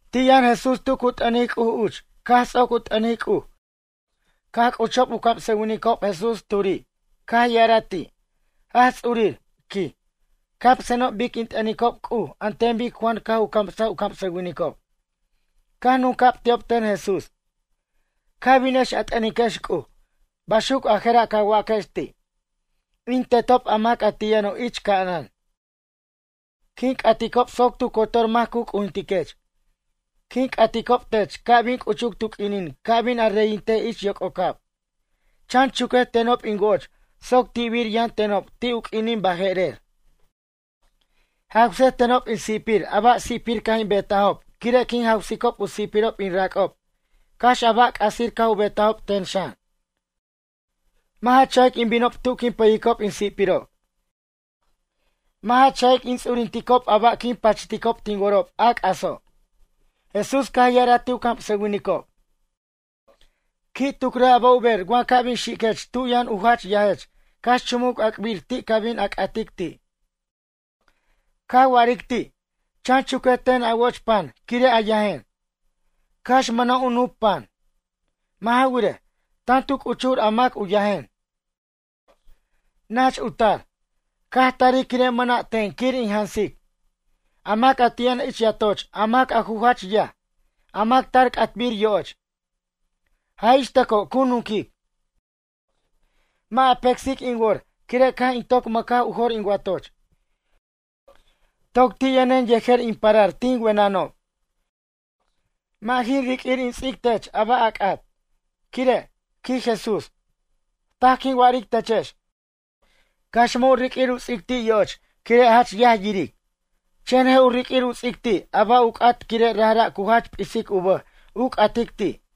Ti' yʌn Jesús tu cu t'ʌnic C'uj uch caj ts'oc u t'ʌnic C'uj caj c'uchob u camsʌwinicob Jesús turi'. Caj ya'araj ti': ―Jach Ts'urir ―quij―, camsenob bic in t'ʌnicob C'uj an ten bic Juan caj u camsaj u camsʌwinicob. Caj nunca'b ti'ob ten Jesús: ―Ca' binex a t'ʌniquex C'uj. Baxuc a je'ra' ca waquex ti': In Tetob a mac ti' yʌno' ich ca'anan. Quin c'atob soc tu cotor mac cu c'ujintiquech. Quin c'aticob tech ca' bin c'uchuc tu q'uinin ca' bin a reyintej ich yoc'ocab. Chan chuquej tenob in woch soc ti'bir yʌn tenob ti' u q'uinin baje'rer. Jawsej tenob in si'pirob a ba' si'pir caj in betajob quire' quin jawsicob u si'pirob in rac'ob cax a ba' c'asir caj u betajob ten xan. Mʌ' ja cha'ic in binob tu quin pʌyicob in si'pirob. Mʌ' ja cha'ic in ts'urinticob a ba' quin pachticob tin worob a c'aso'. Jesús caj ya'araj ti' u camsʌwinicob: ―Qui' tucrej a ba' u ber wa ca' bin xiquech tu yʌn a ju yajech cax chumuc ac'bir ti' ca bin a c'atic ti'. Ca wa'aric ti': “Chan chuquej ten a woch pan quire' a yajen, cax mʌna' u nup pan. Mʌ' ja wirej, tan tu c'uchur a mac u yajen, nach u tar, caj tarij quire' mʌna' ten quir in jansic.” A mac a ti' yʌn ich yatoch a mac a ju jach yaj, a mac tar c'atbir yoch. Jaj ixtʌco cu nunquic: “Mʌ' a pecsic in wor quire' caj in toc mʌcaj u jor in watoch. Toc ti' yʌnen yejer in parar tin wenʌnob. Mʌ' jin riq'uir in ts'ic tech a ba' a c'at.” Quire' ―quij Jesús―, taj quin wa'aric techex. Cax mʌ' u riq'uir u ts'ic ti' yoch quire' jach yaj yiric. Chen je' u riq'uir u ts'ic ti' a ba' u c'at quire' rajra' cu jach p'isic u bʌj u c'atic ti'.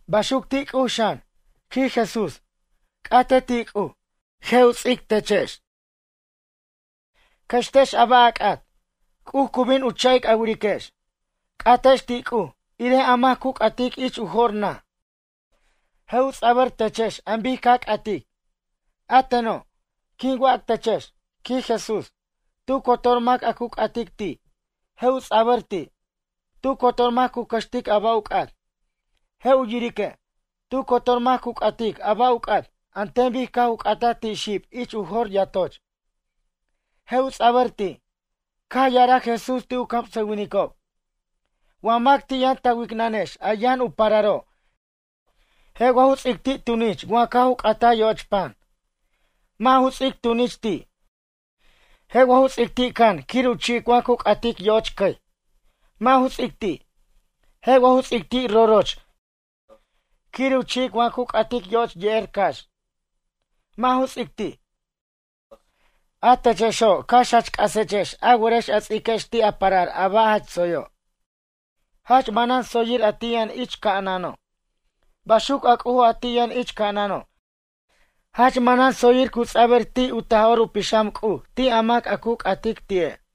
Baxuc ti' C'uj xan ―quij Jesús―: C'atej ti' C'uj, je' u ts'iquex tex. Cʌxtex a ba' a c'at, C'uj cu bin u cha'ic a wiriquex. C'atex ti' C'uj, irej a mac cu c'atic ich u jor naj, je' u ts'abʌr techex an bic ca c'atic. A teno', quin wac techex ―quij Jesús―, tu cotor mac a cu c'atic ti', je' u ts'abʌr ti'. Tu cotor mac cu cʌxtic a ba' u c'at, je' u yirique'. Tu cotor mac cu c'atic a ba' u c'at, an ten bic caj u c'ataj ti' xib ich u jor yatoch. Je' u ts'abʌr ti'. Caj ya'araj Jesús ti' u camsʌwinicob: ―Wa mac ti' yʌn ta wicnʌnex a yʌn u pararo' je' wa ju ts'ic ti' tunich wa caj u c'ataj yoch pan? Mʌ' ju ts'ic tunich ti'. Je' wa ju ts'ic ti' can quir u ch'ic wa cu c'atic yoch cʌy? Mʌ' ju ts'ic ti'. Je' wa ju ts'ic ti' roroch quir u chi'ic wa cu c'atic yoch ye'er cax. Mʌ' ju ts'ic ti'. A techexo' cax jach c'asechex a werex a ts'iquex ti' a parar a ba' jach tsoyo'. Jach manan tsoyir a ti' yʌn ich ca'anano'. Baxuc a C'ujo' a ti' yʌn ich ca'anʌno' jach manan tsoyir cu ts'abʌr ti' u Taj'or u Pixam C'uj ti' a mac a cu c'atic ti'e'.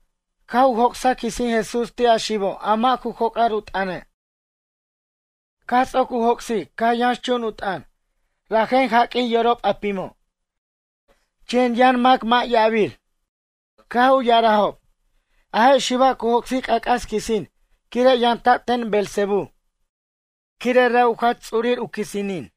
Caj u joc'saj quisin Jesús ti' a xibo' a mʌ' ju joc'ar u t'ʌne'. Caj ts'oc u joc'sic caj yʌnxchun u t'ʌn. Rajen jaq'uij yorob a pimo'. Chen yʌn mac mʌ' ya'abir caj u ya'arajob: ―A je' xiba' cu joc'sic c'ac'as quisin quire' yamta'b ten Beelzebú quire' ra' u Jach Ts'urir u quisinin.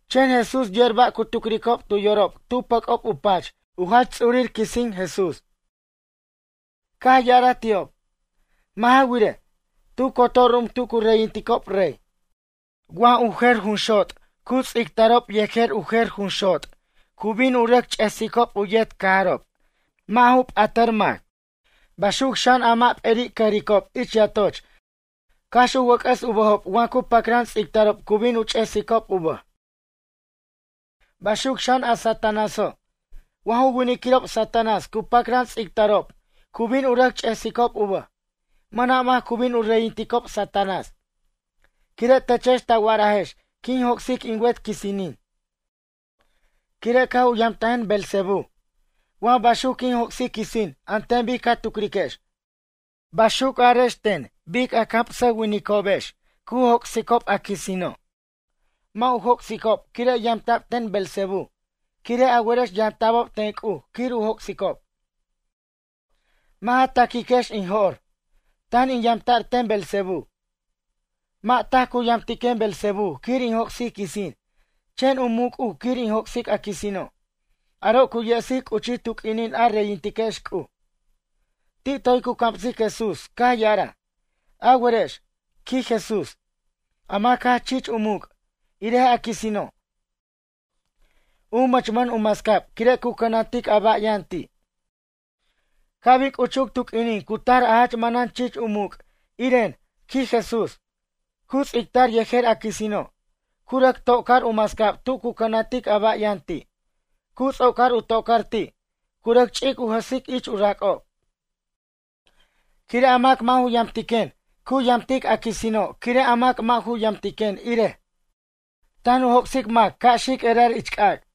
Chen Jesús yer ba' cu tucricob tu yorob tu pʌc'ob u pach u jach ts'urir quisin Jesús. Caj ya'araj ti'ob: ―Mʌ' ja wirej, tu cotor ru'um tu cu reyinticob rey. Wa ju jer junxot cu ts'ictarob yejer u jer junxot cu bin u rʌc ch'esicob u yet cajarob mʌ' ju p'at mac. Baxuc xan a mac p'eri' cʌjricob ich yatoch cax u wʌc'ʌs u bʌjob wa cu pacran ts'ictarob cu bin u ch'esicob u bʌj. Baxuc xan a Satanáso', wa ju winiquirob Satanás cu pacran ts'ictarob cu bin u rʌc ch'esicob u bʌj. Mʌna' mac cu bin u reyinticob Satanás. Quire' techex ta wa'arajex quin joc'sic in wet quisinin. Quire' caj u yamtajen Beelzebú. Wa baxuc quin joc'sic quisin an ten bic ca tucriquex. Baxuc arex ten bic u camsʌwinicobex, cu joc'sicob a quisinino'. Mʌ' u joc'sicob quire' yamta'b ten Beelzebú quire' a werex yamta'bob ten C'uj quir u joc'sicob. Mʌ' ja ta'quiquex in jo'r, tan in yamta'r ten Beelzebú. Mʌ' taj cu yamtiquen Beelzebú quir in joc'sic quisin. Chen u muc' C'uj quir in joc'sic a quisino'. Aro' cu yesic c'uchij tu q'uinin a reyintiquex C'uj. Ti' toy cu camsic Jesús caj ya'araj: ―A werex ―quij Jesús―, a mac jach chich u muc', irej a quisino', u mʌchmʌn u mascab quire' cu cʌnantic a ba' yʌn ti'. Ca' bin c'uchuc tu q'uinin cu tar a jach manan chich u muc', iren ―quij Jesús―. Cu ts'ictar yejer a quisino', cu rʌc to'car u mascab tu cu cʌnantic a ba' yʌn ti', cu ts'ocar u to'car ti', cu rʌc ch'ic u jʌsic ich u rac'ob. ’Quire' a mac mʌ' ju yamtiquen cu yamtic a quisino' quire' a mac mʌ' ju yamtiquen irej, tan u joc'sic mac ca' xic erar ich c'ac'.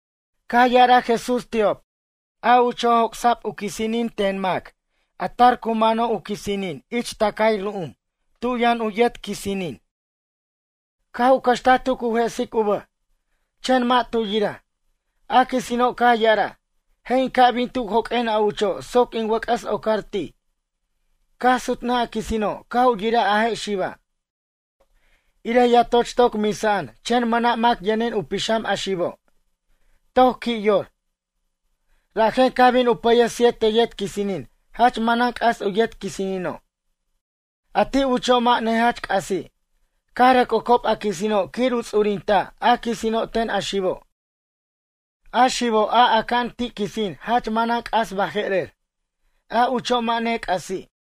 Caj ya'araj Jesús ti'ob: ―A ucho' joc'sa'b quisinin ten mac tar cu mano' u quisinin ich tacay ru'um tu yʌn u yet quisinin. Caj u cʌxtaj tu cu jesic u bʌj. Chen mʌ' tu yiraj. A quisino' caj ya'araj: “Je' in ca' bin tu joq'uen a ucho' soc in wʌc'ʌs ocar ti'.” Caj sutnʌj a quisino' caj u yiraj a je' xiba', irej yatoch toc misa'an chen mʌna' mac yʌnin u pixam a xibo', toc qui' yor. Rajen caj bin u pʌyej siete yet quisinin jach manan c'as u yet quisino'. A ti' ucho' mʌ' nejach c'asi'. Caj rʌc ocob a quisino' quir u ts'urinta' a quisino' ten a xibo'. A xibo' a aca'an ti' quisin jach manan c'as baje'rer, a ucho' mʌ' nec'asi'.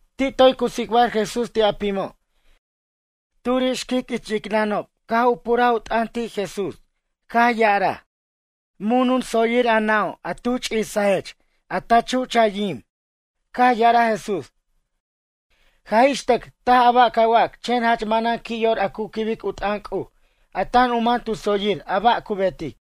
Ti' toy cu tsicbar Jesús ti' a pimo'. Turi' xquic ich yicnʌnob caj u puraj u t'ʌn ti' Jesús caj ya'araj: ―Mun tsoyir a nʌ'o' a tu ch'isajech a ta chuch a yim. Caj ya'araj Jesús: ―Jaj ixtʌc taj a ba' ca wac chen jach manan qui' yor a cu quibic u t'ʌn C'uj a tan u man tu tsoyir a ba' cu betic.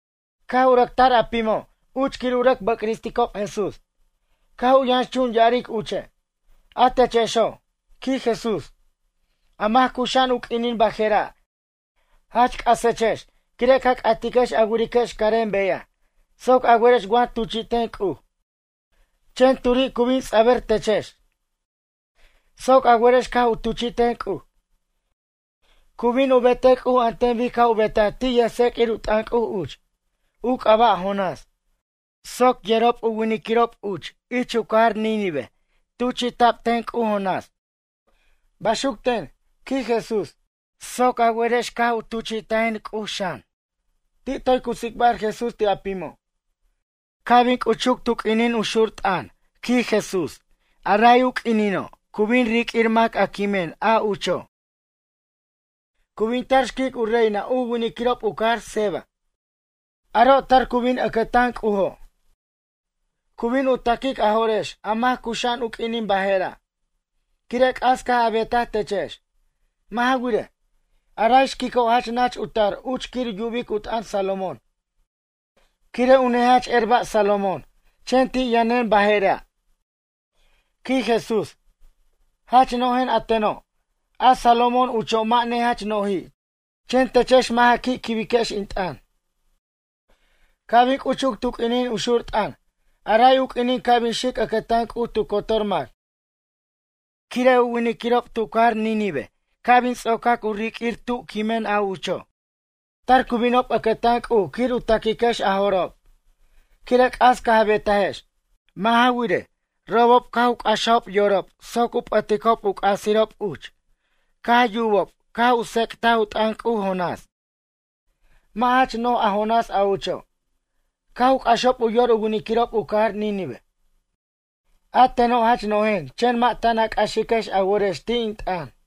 Caj u rʌc tar a pimo' uch quir u rʌc bʌcristicob Jesús, caj u yʌnxchun ya'aric uche': ―A techexo' ―quij Jesús―, a mac cuxa'an u q'uinin bajera' jach c'asechex quire' ca c'atiquex a wiriquex carem beyaj soc a werex wa tuchi'ten C'uj. Chen turi' cu bin ts'abʌr techex soc a werex caj u tuchi'ten C'uj. Cu bin u betej C'uj an ten bic caj u betaj ti' yʌjtseq'uir u t'ʌn C'uj uch, u c'aba' Jonás. Soc yerob winiquirob uch ich u cajar Nínive tuchi'ta'b ten C'uj Jonás. Baxuc ten ―quij Jesús―, soc a wer caj u tuchi'tajen C'uj xan. Ti' toy cu tsicbar Jesús ti' a pimo': ―Ca' bin c'uchuc ―quij Jesús―, tu q'uinin cu xur t'ʌn, a ray u q'uinino', cu bin riq'uir mac a quimen a ucho'. Cu bin tar xquic u reina u winiquirob u cajar Seba. Aro' tar cu bin ʌcʌtan C'ujo', cu bin u ta'quic a jo'rex a mac cuxa'an u q'uinin bajera', quire' c'as caj a betaj techex. Mʌ' ja wirej, a ray xquico' jach nach u tar uch quir yubic u t'ʌn Salomón quire' u nejach er ba' Salomón. Chen ti' yʌnen baje'ra' ―quij Jesús―, jach no'jen a teno'. A Salomón ucho' mʌ' nejach no'ji' chen techex mʌ' ja qui' quibiquex in t'ʌn. Ca' bin c'uchuc tu q'uinin u xur t'ʌn, a ray u q'uinin ca' bin xic ʌcʌtan C'uj tu cotor mac. Quire' u winiquirob tu cajar Nínive ca' bin ts'ocac u riq'uir tu quimen a ucho'. Tar cu binob ʌcʌtan C'uj quir u ta'quiquex a jo'rob. Quire' c'as caj betajex. Mʌ' ja wirej, robob caj u c'axajob yorob soc u p'ʌticob u c'asirob uch caj yubob caj u tsec'tic u t'ʌn C'uj Jonás. Mʌ' jach no'j a Jonás a ucho'. Caj u c'axob u yor u winiquirob u cajar Nínive. A teno' jach no'jen chen mʌ' tan a c'axiquex a worex ti' in t'ʌn.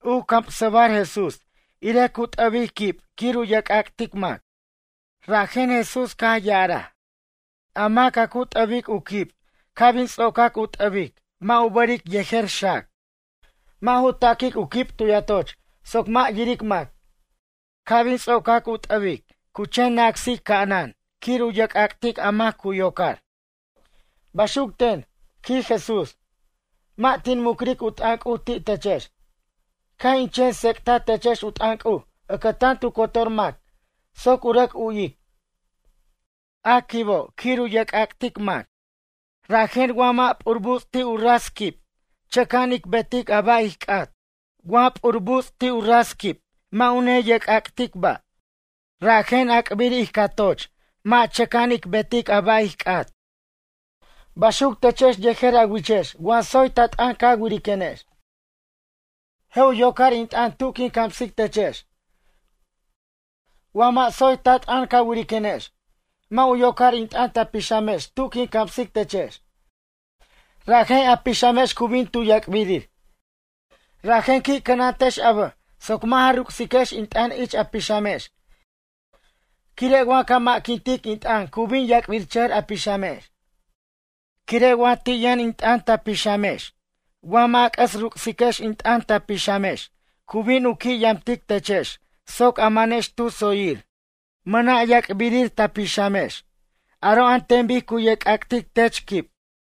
U camsa'bar Jesús, irej cu t'ʌbic quib quir u yerc'ac'tic mac. Rajen Jesús caj ya'araj: ―A mac a cu t'ʌbic u quib ca' bin ts'ocar u t'ʌbic mʌ' u bʌric yejer xac. Mʌ' ju ta'quic u quib tu yatoch soc mʌ' yiric mac. Ca' bin ts'ocar u t'ʌbic cu chen na'sic ca'anan quir yerc'ac'tic a mac a cu yocar. Baxuc ten ―quij Jesús―. Mʌ' tin mucric u t'ʌn C'uj ti' techex. Caj in chen tsec'taj techex u t'ʌn C'uj ʌcʌtan tu cotor mac soc u rʌc u'wic. A quibo' quir u yerc'ac'tic mac. Rajen wa mʌ' p'ur buts' ti' u ras quib chʌca'an ic betic a ba' ij c'at. Wa p'ur buts' ti' u ras quib mʌ' u neyerc'ac'tic ba'. Rajen ac'bir ij cʌjtoch soc mʌ' chʌca'an ic betej a ba' ij c'at. Baxuc techex yejer a wichex wa tsoy ta t'ʌn ca wiriquenex, je' u yocar in t'ʌn tu quin camsic techex. Wa mʌ' tsoy ta t'ʌn ca wiriquenex, mʌ' u yocar in t'ʌn ta pixamex tu quin camsic techex, rajen a pixamex cu bin tu yac'birir. Rajen qui' cʌnantex a bʌj soc mʌ' ja ruc'siquex in t'ʌn ich a pixamex quire' wa ca mʌ'quintic in t'ʌn cu bin yac'birchʌjʌr a pixamex. Quire' wa ti' yʌn in t'ʌn ta pixamex wa mʌ' a c'ʌs ruc'siquex in t'ʌn ta pixamex cu bin u qui' yamtic techex soc a manex tu tsoyir. Mʌna' yac'birir ta pixamex. Aro' an ten bic cu yerc'ac'tic tech quib.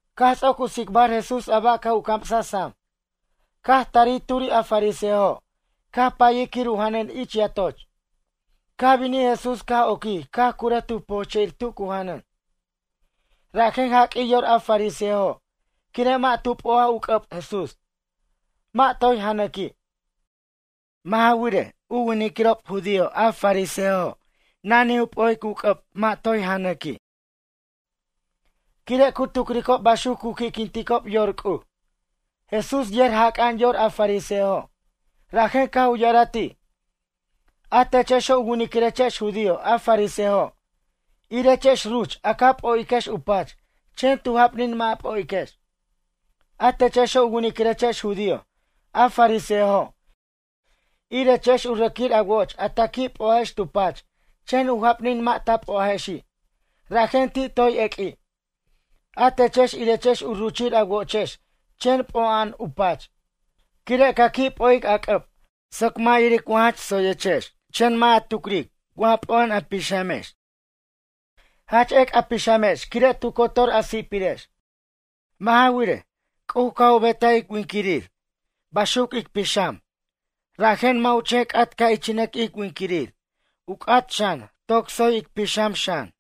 Caj ts'oc u tsicbar Jesús a ba' caj u camsaj sam. Caj tari' turi' a fariseojo' caj payij quir u janʌn ich yatoch. Caj binij Jesús caj oquij caj curʌj tu pojche'ir tu cu janʌn. Rajen jaq'uij yor a fariseojo' quire' mʌ' tu p'o'aj u c'ʌb Jesús, mʌ' toy janʌqui'. Mʌ' ja wirej, u winiquirob judío a fariseojo' nanij u p'o'ic u c'ʌb mʌ' toy janʌqui'. Quire' cu tucricob baxuc cu qui'quinticob yor C'uj. Jesús yer jac'a'an yor a fariseojo', rajen caj u ya'araj ti': ―A techexo' u winiquirechex judío a fariseojo', irechex ruch a ca p'o'iquex u pach chen tu japnin mʌ' a p'o'iquex. A techexo' u winiquirechex judío a fariseojo' irechex u rʌquir a woch a ta qui' p'o'ajex tu pach chen u japnin mʌ' ta p'ojechexi', rajen ti' toy eq'ui'. A techex irex u ruchir a wochex chen p'o'a'an u pach, quire' ca qui' p'o'ic a c'ʌb soc mac yiric jach tsoyechex chen mʌ' a tucric wa p'o'a'an a pixamex. Jach ec' a pixamex quire' tu cotor a si'pirex. Mʌ' ja wirej, C'uj caj u betaj ic winiquir baxuc ic pixam, rajen mʌ' u chen c'at ca' ichinʌco'on ij winiquir, u c'at xan toc tsoy ic pixam xan.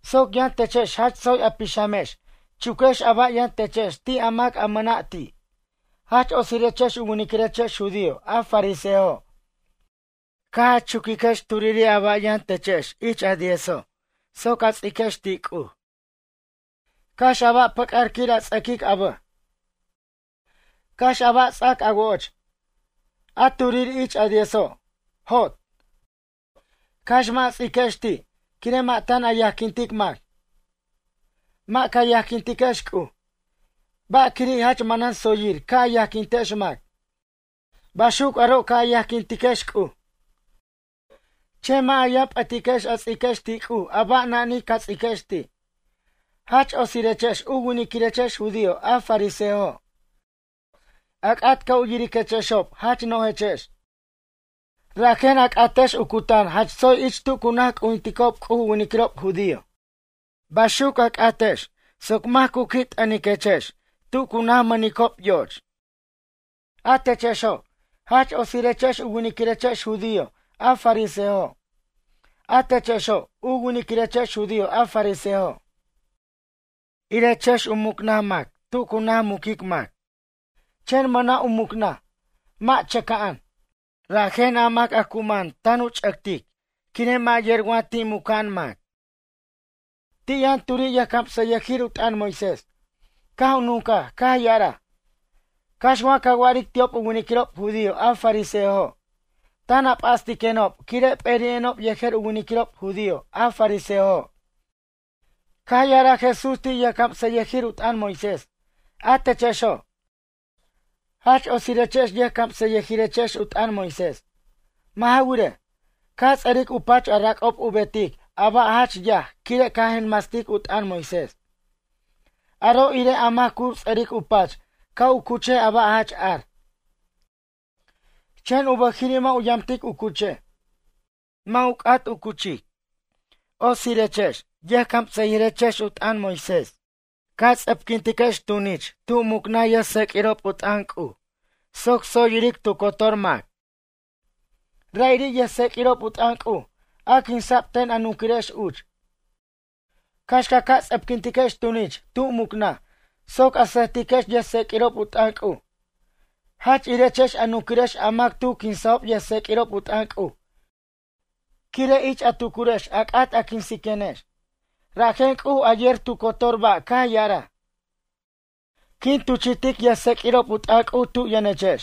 Soc yʌn techex jach tsoy a pixamex chuquex a ba' yʌn techex ti' a mac a mʌna' ti'. ’Jach otsirechex u winiquirechex judío a fariseojo' caj a chuquiquex turiri' a ba' yʌn techex ich a diezo' soc a ts'iquex ti' C'uj. Cax a ba' pʌc'ar quir a ts'ʌquic a bʌj, cax a ba' a ts'ac a woch, a turiri' ich a diezo'. Jot, cax mʌ' a ts'iquex ti', quire' mʌ' tan a yajquintic mac, mʌ' ca yajquintex C'uj. Ba' quiri' jach manan tsoyir ca' a yajquintex mac. Baxuc aro' ca' a yajquintiquex C'uj. Chen mʌ' a yʌn p'ʌtiquex a ts'iquex ti' C'uj a ba' nani ca ts'iquex ti'. ’Jach otirechex u winiquirechex judío a fariseojo'. A c'at ca' u yiriquechexob jach no'jechex. Rajen a c'atex u cutan jach tsoy ich tu cu naj c'ujinticob C'uj u winiquirob judío. Baxuc a c'atex soc mac cu qui' t'ʌniquex tu cu najmʌnicob yoch. ’A techexo', jach otsirechex u winiquirechex judío a fariseojo'. A techexo', u winiquirechex judío a fariseojo' irechex u mucnaj mac tu cu najmuquic mac, chen mʌna' u mucnaj, mʌ' chʌca'an. Rajen a mac a cu man tan u ch'ʌctic quire' mʌ' yer wa muca'an mac ti'. Ti' yʌn turi' yʌjcamsʌyʌjir u t'ʌn Moisés caj u nuncaj caj ya'araj: ―Cax ca wa'aric ti'ob u winiquirob judío a fariseojo' tan a p'astiquenob quire' p'eri'enob yejer u winiquirob judío a fariseojo'. Caj ya'araj Jesús ti' yʌjcamsʌyʌjir u t'ʌn Moisés: ―A techexo', jach otsirechex yʌjcamsʌyʌjirechex u t'ʌn Moisés. Mʌ' ja wirej, ca ts'ʌric u pach a rac'ob u betic a ba' jach yaj quire' ca jenmastic u t'ʌn Moisés. Aro' irej a mac cu ts'ʌric u pach ca' u cuchej a ba' jach ar, chen u bʌjiri' mʌ' u yamtic u cuchej. Mʌ' ju c'at u cuchej. ’Otsirechex yʌjcamsʌyʌjirechex u t'ʌn Moisés, ca ts'ʌpquintiquex tunich tu mucnaj yʌjtsequirob u t'ʌn C'uj soc tsoy yiric tu cotor mac. Ra'iri' yʌjtseq'uirob u t'ʌn C'uj a quinsa'b ten a nunquirex uch. Cax ca ts'ʌpquintiquex tunich tu mucnaj soc a sʌjtiquex yʌjtseq'uirob u t'ʌn C'uj. Jach irex a nunquirex a mac tu quinsajob yʌjtseq'uirob u t'ʌn C'uj quire' ich a tucurex a c'at a quinsenex. ’Rajen C'uj a yer tu cotor ba' caj ya'araj: “Quin tuchi'tic yʌjtseq'uirob u t'ʌn C'uj tu yʌnechex,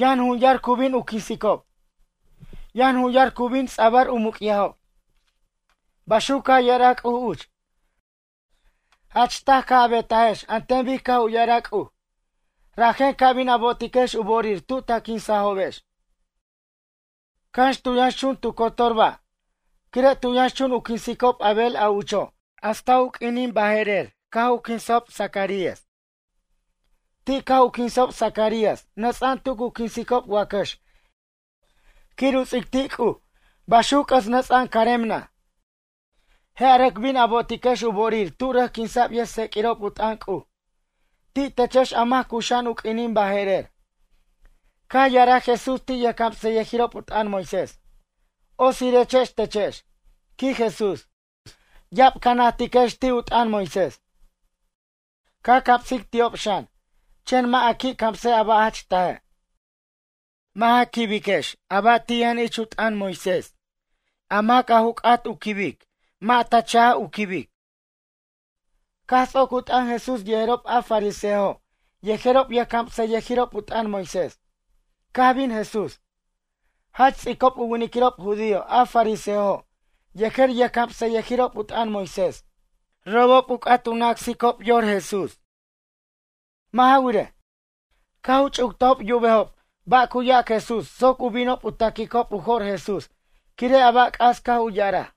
yʌn jun yar cu bin u quinsicob, yʌn jun yar cu bin ts'abʌr u muc'yajob”, baxuc caj ya'araj C'uj uch. Jach taj caj a betajex an ten bic caj u ya'araj C'uj. Rajen ca bin a bo'otiquex u bo'orir tu ta quinsajobex, cax tu yʌnxchun tu cotor ba'. Quire' tu yʌnxchun u quinsicob Abel a ucho' hasta u q'uinin baje'rer caj u quinsajob Zacarías. Ti' caj u quinsajob Zacarías nʌts'a'an tu cu quinsicob wacʌx quir u ts'ic ti' C'uj baxuc c'ʌs nʌts'a'an carem naj. Je' a rʌc bin a bo'otiquex u bo'orir tu rʌc quinsa'b yʌjtseq'uirob u t'ʌn C'uj. Ti' techex a mac cuxa'an u q'uinin baje'rer. Caj ya'araj Jesús ti' yʌjcamsʌyʌjirob u t'ʌn Moisés: ―Otsirechex techex ―quij Jesús―, ya'ab ca najtiquex ti' u t'ʌn Moisés. Ca camsic ti'ob xan, chen mʌ' a qui' camsej a ba' jach taje'. Mʌ' ja quibiquex a ba' ti' yʌn ich u t'ʌn Moisés. A mac a ju c'at u quibej mʌ' a cha'ic u quibic. Caj ts'oc u t'ʌn Jesús yejerob a fariseojo' yejerob yʌjcamsʌyʌjirob u t'ʌn Moisés, caj bin Jesús, jach ts'icob u winiquirob judío a fariseojo' yejer yʌjcamsayʌjirob u t'ʌn Moisés robob u c'at na'sicob yor quinsac Jesús. Mʌ' ja wirej, caj u ch'uctajob yubejob ba' cu yac Jesús soc u binob u ta'quicob u jo'r Jesús quire' a ba' c'as caj u ya'araj.